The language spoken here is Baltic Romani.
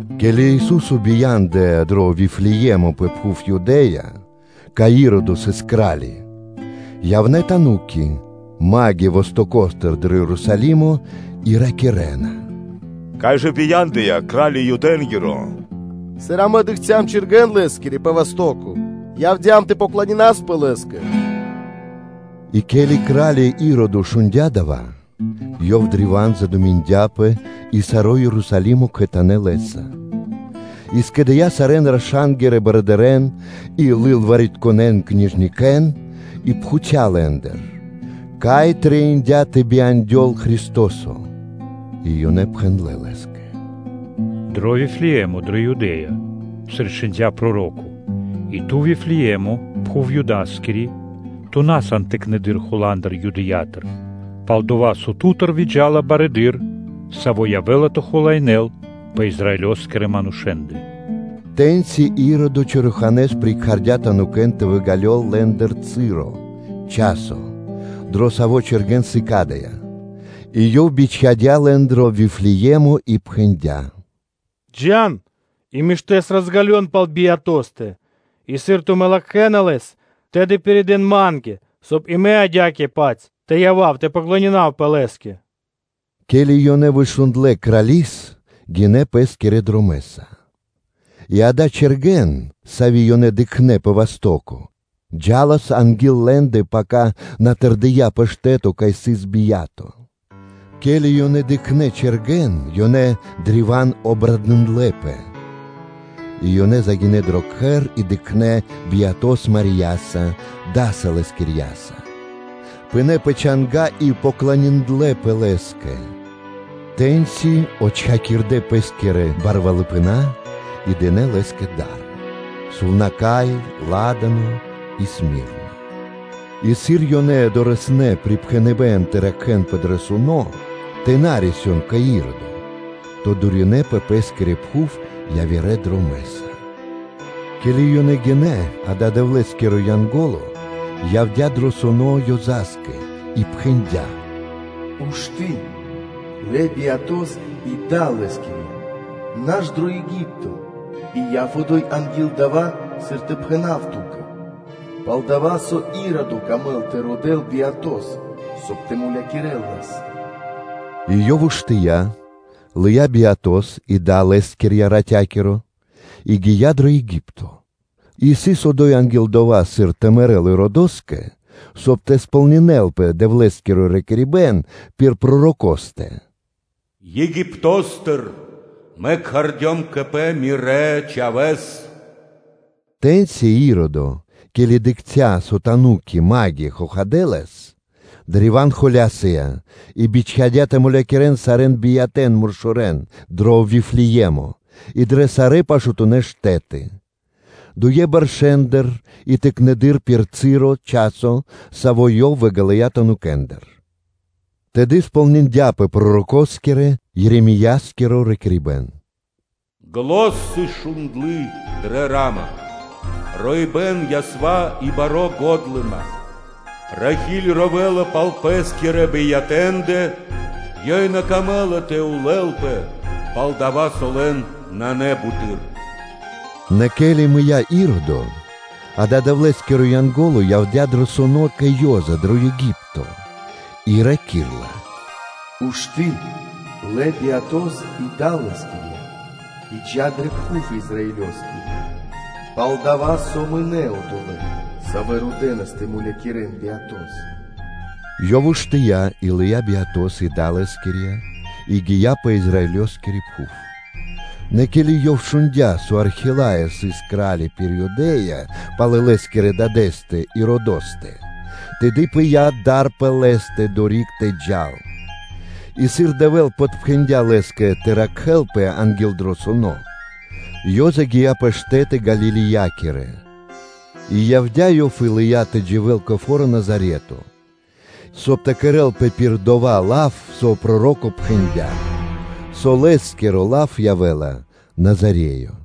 Ке́ли Ису́со бия́ндыя дро Вифлее́мо пэ пхув Юдэ́я, кай Иродо сыс кра́ли, явнэ́ тануки (маги) вастоко́стыр дро Ерусалимо и ракирэ́на: “Кай жа исын Юдэ́нгиро Кра́ли, Саво́ бия́ндыя? Сыр амэ дыкхцям чэргэн Лэ́скири пэ васто́ко, явдя́м тэ поклонинаспэ Лэ́скэ.” И ке́ли кра́ли Иродо шундя́ дава́, ёв древа́н задуминдяпэ (лыя́ пэ́скэ дро шэро́), и саро́ Ерусалимо кхэтанэ́ лэ́са. И скэдыя́ кра́ли сарэ́н раша́нгирэ барыдырэ́н и лылваритконэн (книжникэн), и пхуця́ лэ́ндыр, кай трэиндя́ тэ бияндёл Христо́со? И ёнэ пхэндлэ́ лэ́скэ: “Дро Вифлее́мо пэ пхув Юдэ́я”; сыр и чхиндя́ проро́ко: “И ту, Вифлее́мо, пхув Юдаскири, ту на сан тыкнэды́р Хуландыр Юдэя́тыр; пал-дова́ со ту́тыр выджа́ла Шэрало́, Саво́ явэ́ла тэ хулаинэ́л пэ Израилёскирэ манушэ́ндэ.” Тэ́ньци Иродо чораханэ́с прикхардя танукэн тэ выґалёл лэ́ндыр часо (цы́ро), дро саво́ чэргэн сыкадыя́; и ёв бичхадя́ лэн дро Вифлее́мо и пхэндя́: “Джа́н и лачхэ́с розґалён пал Биятостэ (Чхаворэ́стэ); и, сыр тумэ́ латхэ́на Лэс, тэды пиридэ́н ма́нгэ, соб (кай) и мэ адя́кэ-паць (то́жэ) тэ явав тэ поклонинавпэ Лэ́скэ.” Ке́ли ёнэ вышундлэ крали́с, гинэ́ ёнэ пэ́скирэ дромэ́са, и акэ, чэргэн, сави́ ёнэ дыкхнэ́ пэ васто́ко, джа́лас анги́л лэ́ндэ, пака на тэрдия́ пэ штэ́то, кай сыс Бия́то. Ке́ли ёнэ дыкхнэ́ чэргэн, ёнэ древа́н обрадындлэпэ. И ёнэ загинэ́ дро кхэр и дыкхнэ́ Биятос Марияса, даса Лэскирьяса, пынэ́ пэ чанга́ и поклониндлэпэ Лэ́скэ; тэ́ньчи отчхакирдэ пэ́скирэ кучипэна (сокровишчы) и дынэ́ Лэ́скэ да́ры: сувнака́й, ладано и смирна. И сыр ёнэ дорэснэ́ припхэныбэ́н тэ ракхэ́нпэ дро суно́, и тэ на рисён кэ Иродо, то дуринэ ёнэ пэ пэ́скири пхув явирэ дромэ́са. Ке́ли ёнэ гинэ́, акэ, Дэвлэ́скиро Янго́ло, явдя́ дро суно́ Ёза́скэ и пхэндя́: “Ушты́, лэ Биятос и Да Лэскирья, наш дро Еги́пто, и яв одо́й анги́л дава́, сыр тэ пхэна́в ту́кэ: пал-дова́ со Иродо камэ́ла тэ родэ́л Биятос, соб (кай) тэ мулякирэ́л Лэс.” И ёв уштыя́, лыя́ Биятос и Да Лэскирья ратя́киро, и гия́ дро Еги́пто, и сыс одо́й анги́л дова́, сыр тэ мэрэ́л Иродоскэ, соб (кай) тэ сполнинэ́лпэ Дэвлэ́скиро ракирибэ́н пир пророкостэ: “Египто́стыр Мэ кхардём кэ Пэ Мирэс Чхавэ́с.” Тэ́ньци Иродо, ке́ли дыкхця́, со тануки (маги) хохадэ лэс, древа́н холя́сыя и бичхадя́ тэ мулякирэ́н сарэ́н биятэ́н-муршорэн дро Вифлее́мо и дрэ сарэ́ пашатунэ́ штэ́ты, дуендыр бэршэ́ндыр и тыкнэды́р пир часо, саво́ ёв выґалыя танукэндыр. Тэды сполниндяпэ пророкоскирэ-Еремеёскиро ракирибэ́н: “Зан (глос) сыс шундлы дрэ Ра́ма, роибэ́н, ясва и бари годлыма; Рахи́ль ровэла пал пэ́скирэ биятэндэ, ёй на камэ́ла, соб (кай) тэ подрикирэн ла, пал-дова́ со лэн нанэ буты́р.” Нэ ке́ли мыя́ Иродо, акэ, Дэвлэ́скиро Янго́ло явдя́ дро суно́ кэ Ёза дро Еги́пто, и раки́рла: “Ушты́, лэ Биятос и Да Лэскирья, и джа́ пэ пхув Израилёскири; пал-дова́ со мынэ́ одолэ́, савэ́ родэнас тэ мулякирэ́н Биятос.” Ёв уштыя́ и лыя́ Биятос и Да Лэскирья, и гия́ пэ Израилёскири пхув. Нэ ке́ли ёв шундя́, со Архелаё сыс кра́ли пири́ Юдэ́я пало́ лэ́скирэ дадэ́стэ Иродостэ, тэды пыя́ дар пэ лэ́стэ одорик тэ джал; и, сыр Дэвэ́л подпхэндя лэ́скэ тэ ракхэлпэ анги́л дро суно́, Ёза гия́ пэ штэ́ты Галилеякирэ. И явдя́ ёв и лыя́ тэ дживэ́л кэ фо́ро Назарето, соб (кай) тэ кэрэ́лпэ пир дова́ лав, со проро́ко пхэндя́: “Со Лэ́скиро лав явэ́ла Назареё.”